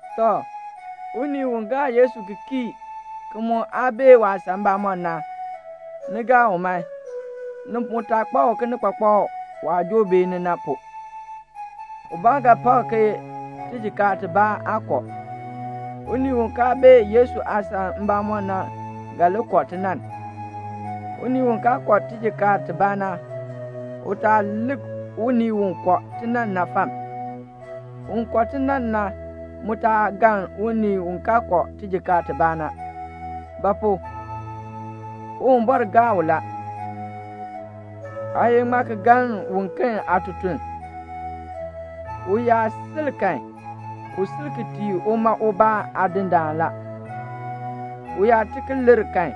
Tɔ, unii u gaa Yesu ki kii, ki mu aa bee waasan mbamɔm na, ni gaa u man. Ni mu taa kpak u kinikpakpak waah joo beeni na pu. Ubaa ga pak ke tijikaar tibaa aa kɔ. Unii u kaa bee Yesu aasan mbamɔm na ga li kɔ tinann. Unii u kaa kɔ tijikaar tibaa na, u taa lik unii u kɔ tinann na fam. Un kɔ tinann na mu taa galn un kaa kɔ tijikaar tibaa na; ba pu? Uwumbɔr gaa u la. Aa ye ŋmaa ki galn uken aatutuln? U yaa sil kan, u sil ki tii uma ubaa Aadindaan la. U yaa ti ki lir kan,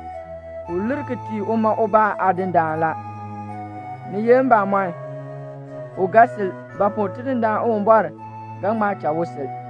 u lir ki tii uma ubaa Aadindaan la. Ni ye mbamɔn, u ga sil; ba pu? Tidindaan Uwumbɔr ga ŋma cha u sil.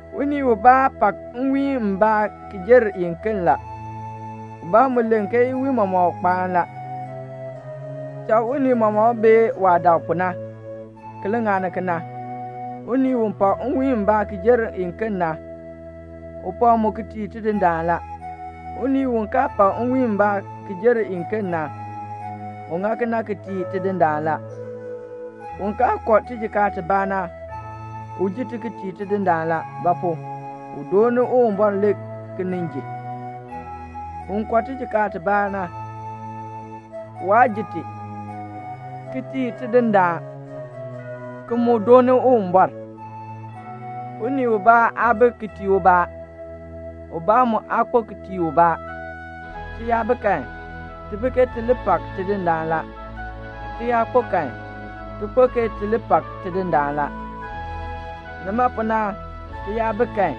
Unii ubaa pak nwiin mbaa ki jer iken la. Ubaa mu len ke iwiin mɔmɔk kpaan la. Cha unii mɔmɔk bee waah dak pu na, ki li ŋani kena. Unii u pak nwiin mbaa ki jer iken na, u pak mu ki tii Tidindaan la. Unii u kaa pak nwiin mbaa ki jer iken na, u ŋa kena ki tii Tidindaan la. Un kaa kɔ tijikaar tibaa na, u ji ti ki tii Tidindaan la; ba pu? u dooni Uwumbɔr le ki nin ji. Un kɔ tijikaar tibaa na, waa ji ti, ki tii Tidindaan, ki mu dooni Uwumbɔr. Unii ubaa aa bi ki tii ubaa. Ubaa mu aa kpo ki tii ubaa. Ti yaa bi kan, ti bi ke ti li pak Tidindaan la. Ti yaa kpo kan, ti kpo ke ti li pak Tidindaan la. Nima pu na ti yaa bi kan,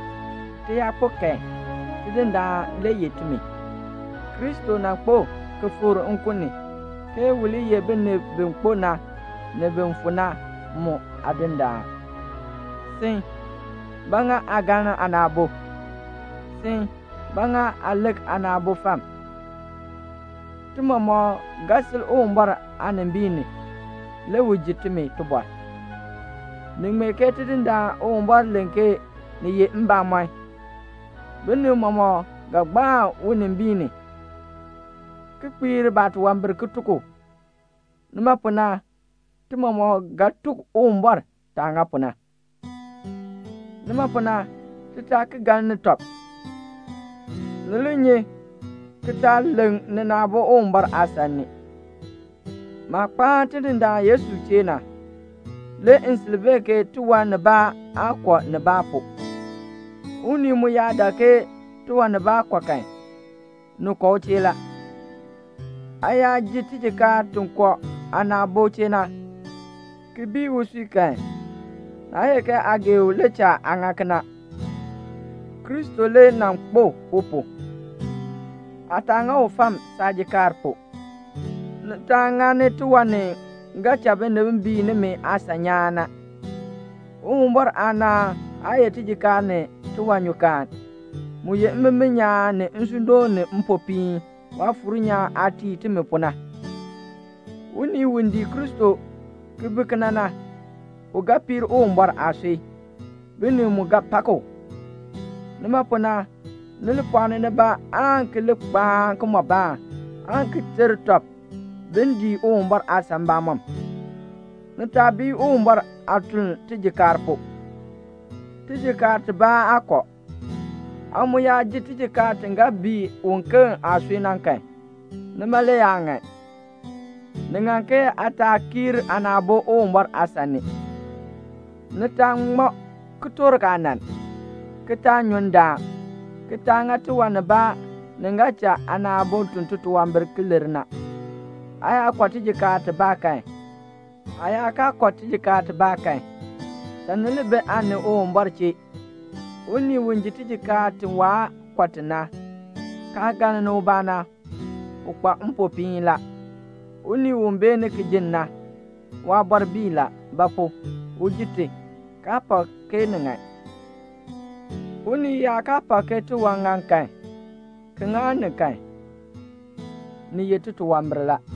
ti yaa kpo kan, Tidindaan le yeh timi. Kristo nan kpo ki fikr nkun ni, ke u li ye binib bi kpo na, ni bin fu na mu Aadindaan. Sin, ba ŋa aa galn aana aabo? Sin, ba ŋa aa lik aana aabo fam? Ti mɔmɔk ga sil Uwumbɔr aanimbiin ni, le u ji timi tibɔr. Ni ŋmee ke Tidindaan Uwumbɔr len ke ni ye mbamɔn, binib mɔmɔk ga gbaan unimbiin ni, ki kpiir baatunwambir ki tuk u. Nima pu na ti mɔmɔk ga tuk Uwumbɔr taah ŋa pu na. Nima pu na ti taa ki galni tɔb. Ni li nyi ki taa leŋ nina aabo Uwumbɔr aasan ni. Maah kpaan Tidindaan Yesu chee na, le m sil bee ke tiwan nibaa aa kɔ nibaa pu. Unii mu yaa dak ke tiwan nibaa kɔ kan, ni kɔ u chee la. Aa yaa ji tijikaar ti kɔ aana aabo chee na, ki bii usui kan, naa ye ke aa gee u le cha aa ŋa kena. Kristo le nan kpo u pu. Aa taa ŋa u fam saajikaar pu. Ni taa ŋani tiwan ni ga cha binib bii nimi aasan nyaan. Uwumbɔr aanaan aa ye tijikaar ni tiwanyukaan. Mu ye mbimbin nyaan ni nsuudoon ni mpopiin, Waafuur nyaan aah tii timi pu na. Unii u dii Kristo ki bi kena na, u ga piir Uwumbɔr aasui. Binib mu ga pak u. Nima pu na ni li pɔɔni nibaa aan ki li kpaan kimɔbaan, aan ki ter tɔb bin dii Uwumbɔr aasan mbamɔm. Ni taa bii Uwumbɔr aatuln tijikaar pu. Tijikaar tibaa aa kɔ. Aa mu yaa ji tijikaar ti ga bii uken aasui na kan, nima le aa ŋan. Ni ŋan ke aa taa kiir aana aabo Uwumbɔr aasan ni; ni taa ŋma kitork aanann, ki taa nyu ndaan, ki taa ŋa tiwan nibaa ni ga cha aana aabo tun titunwambir ki lir na. Aa yaa kɔ tijikaar tibaa kan, aa yaa kaa kɔ tibaa kan, cha ni li bi aa ni Uwumbɔr chee. Unii u ji tijikaar ti waa kɔ ti na, kaa galni ubaa na, u kpa mpopiin la. Unii u beeni ki ji na, waabɔr bii la; ba pu? u ji ti, kaa pak ke ni ŋan. Unii yaa kaa pak ke tiwan ŋan kan, ki ŋani kan, ni ye titunwambir la.